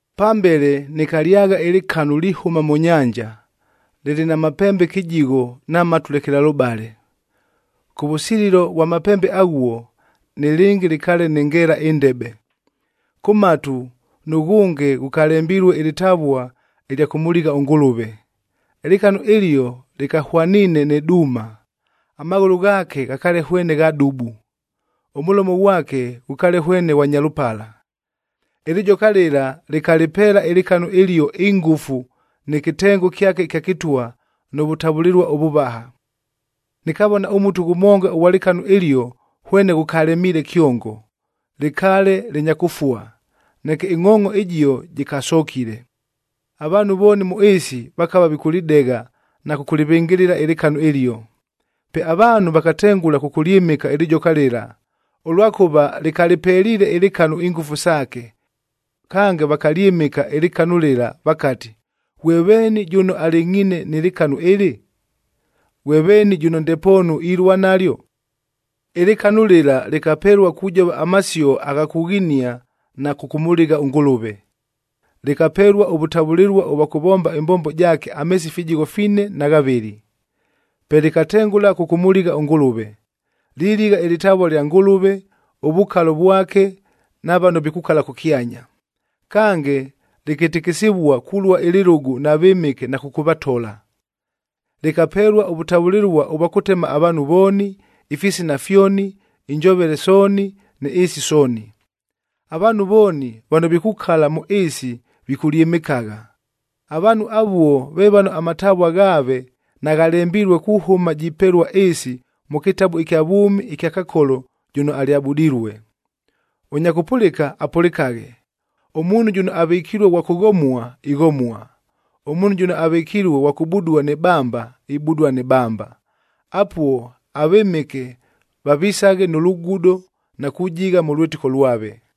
Pambele nɨkalyagha ɨlɨkanu lihʉma mʉ nyanja, lɨlɨ na mapembe kɨjigho na matu lekelalʉbale. Kʉvʉsililo vwa mapembe aghuo, nɨlɨngɨ lɨkaale nɨ ngeela ɨndebe. Kʉ matu, nʉghʉnge ghʉkalembilue ɨlɨtavua ɨlya kʉmʉligha ʉNgʉlʉve. Ɨlɨkanu ɨlio lɨkahwaniine nɨ duuma, amaghʉlʉ ghaake ghakaale hwene gha dubu, ʉmʉlomo ghwake ghʉkaale hwene ghwa nyalʉpala. Ɨlɨjoka lɨla lɨkalɨpeela ɨlɨkanu ɨlio ingʉfu nɨ kɨtengo kyake ɨkya kɨtwa nʉ vʉtavʉlɨlua ʉvʉvaha. Nɨkavona ʉmutu ghʉmonga ʉghwa lɨkanu ɨlio hwene ghʉkalemiile kyongo, lɨkaale lɨnya kʉfua, neke ɨngʼhoongʼo ɨjio jɨkasokile. Avaanhu vooni mʉ ɨɨsi vakava vikʉlɨdegha na kʉkʉlɨvɨngɨlɨla ɨlɨkanu ɨlio. Pe avaanhu vakatengʉla kʉkʉlyɨmɨka ɨlɨjoka lɨla, ʉlwakʉva lɨkalɨpeliile ɨlɨkanu ingʉfu saake. Kange, vakalyɨmɨka ɨlɨkanu lɨla vakati, “Ghwe veeni jʉno alɨngʼhiine nɨ lɨkanu ɨlɨ? Ghwe veeni jʉno ndepoonu ilua nalyo?” Ɨlɨkanu lɨla lɨkapelua kujova amasio agha kughinia na kʉkʉmʉligha ʉNgʉlʉve. Lɨkapelua ʉvʉtavʉlɨlua ʉvwa kʉvomba ɨmbombo jaake ameesi fijigho fine na ghavɨlɨ. Pe lɨkatengʉla kʉkʉmʉligha ʉNgʉlʉve: liligha ɨlɨtavua lya Ngʉlʉve, ʉvukalo vwake na vano vikukala kʉkyanya. Kange, lɨkɨtɨkɨsɨvua kulua ɨlɨlʉgʉ na vɨmɨke na kʉkʉvatola. Lɨkapelua ʉvʉtavʉlɨlua ʉvwa kʉtema avaanhu vooni, ifisina fyoni, injovele sooni ni ɨɨsi sooni. Avaanhu vooni vano vikukala mʉ ɨɨsi vikʉlyɨmɨkagha. Avaanhu avuo ve vano amatavua ghaave naghalembilue kuhʉma jipelua ɨɨsi mʉ kɨtabu ɨkya vwʉmi ɨkya Kakolo jʉno alyabudilue. Ʉnya kʉpʉlɨka, apʉlɨkaghe. Ʉmuunhu jʉno avɨkilue ghwa kʉghomua, ighomua. Ʉmuunhu jʉno avɨkilue ghwa kʉbudua nɨ bamba, ibudua nɨ bamba. Apuo avɨmɨke vavisaghe nʉ lugudo na kujigha mʉ lwɨtɨko lwave.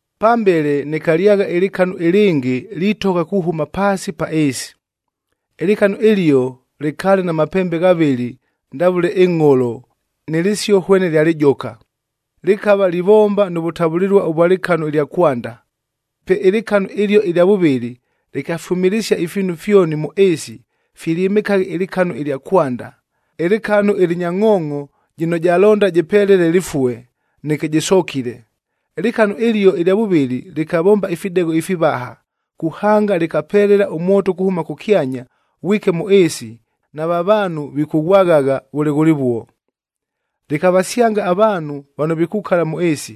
Pambele nɨkalyagha ɨlɨkanu ɨlɨngɨ litogha kuhʉma paasi pa ɨɨsi. Ɨlɨkanu ɨlio lɨkaale na mapembe ghavɨlɨ ndavʉle ɨngʼholo nɨ lɨsio hwene lya lɨjoka. Lɨkava livomba nʉ vʉtavʉlɨlua ʉvwa lɨkanu ɨlya kwanda. Pe ɨlɨkanu ɨlio ɨlya vʉvɨlɨ lɨkafyʉmɨlɨsia ifiinu fyoni mʉ ɨɨsi filyɨmɨkaghe ɨlɨkanu ɨlya kwanda, ɨlɨkanu ɨlɨnya ngʼhoongʼo jɨno jalonda jɨpelele lɨfue, neke jɨsokile. Ɨlɨkanu ɨlio ɨlya vʉvɨlɨ lɨkavomba ifidegho ifivaha, kuhanga lɨkapelela ʉmwoto kuhʉma kʉkyanya, ghwike mʉ ɨɨsi nava vaanhu vikʉghwagha vʉle ghʉlɨvuo. Lɨkavasyanga avaanhu vano vikukala mʉ ɨɨsi.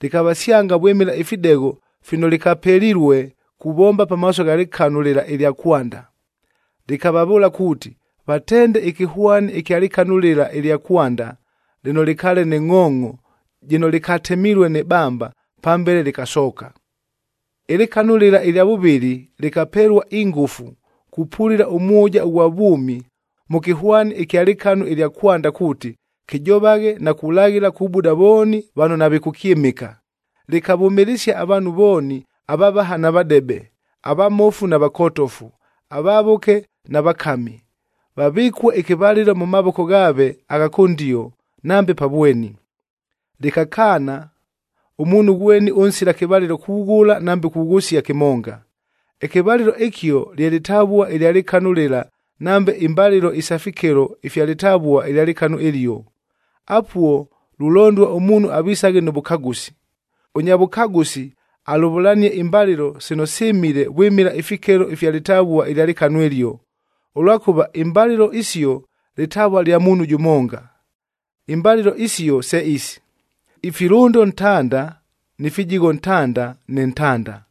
Lɨkavasyanga vwɨmɨla ifidegho fino lɨkapelilue kuvomba pamaaso gha lɨkanu lɨla ɨlya kwanda. Lɨkavavʉʉla kuuti, vatende ɨkɨhwani ɨkya lɨkanu lɨla ɨlya kwanda lɨno lɨkaale nɨ ngʼhoongʼo jɨno lɨkatemilue nɨ bamba, pambele lɨkasooka. Ɨlɨkanu lɨla ɨlya vʉvɨlɨ, lɨkapelua ingʉfu kupulila ʉmwʉja ʉghwa vwʉmi mʉ kɨhwani ɨkya lɨkanu ɨlya kwanda kuuti, kɨjovaghe na kulaghila kubuda vooni vano navikʉkyɨmɨka. Lɨkavʉmɨlɨsia avaanhu vooni avavaha na vadebe, avamofu na vakotofu, avavʉke na vakami, vavɨkue ɨkɨvalɨlo mʉ mavoko ghaave agha kʉndio nambe pa vweni. Lɨkakaana ʉmuunhu ghweni ʉnsila kɨvalɨlo kughʉla nambe kughʉsia kɨmonga. Ɨkɨvalɨlo ɨkio lye lɨtavua ɨlya lɨkanu lɨla nambe imbalɨlo isa fikelo ifya lɨtavuaa ɨlya lɨkanu ɨlio. Apuo lulondua ʉmuunhu avisaghe nʉ vʉkagʉsi. Ʉnya vʉkagʉsi alʉvʉlanie imbalɨlo sino sɨmile vwɨmɨla ifikelo ifya lɨtavua ɨlya lɨkanu ɨlio, ʉlwakʉva imbalɨlo isio lɨtavua lya muunhu jʉmonga. Imbalɨlo isio se isi: ifilʉndo ntanda ni fijigho ntanda nɨ ntanda.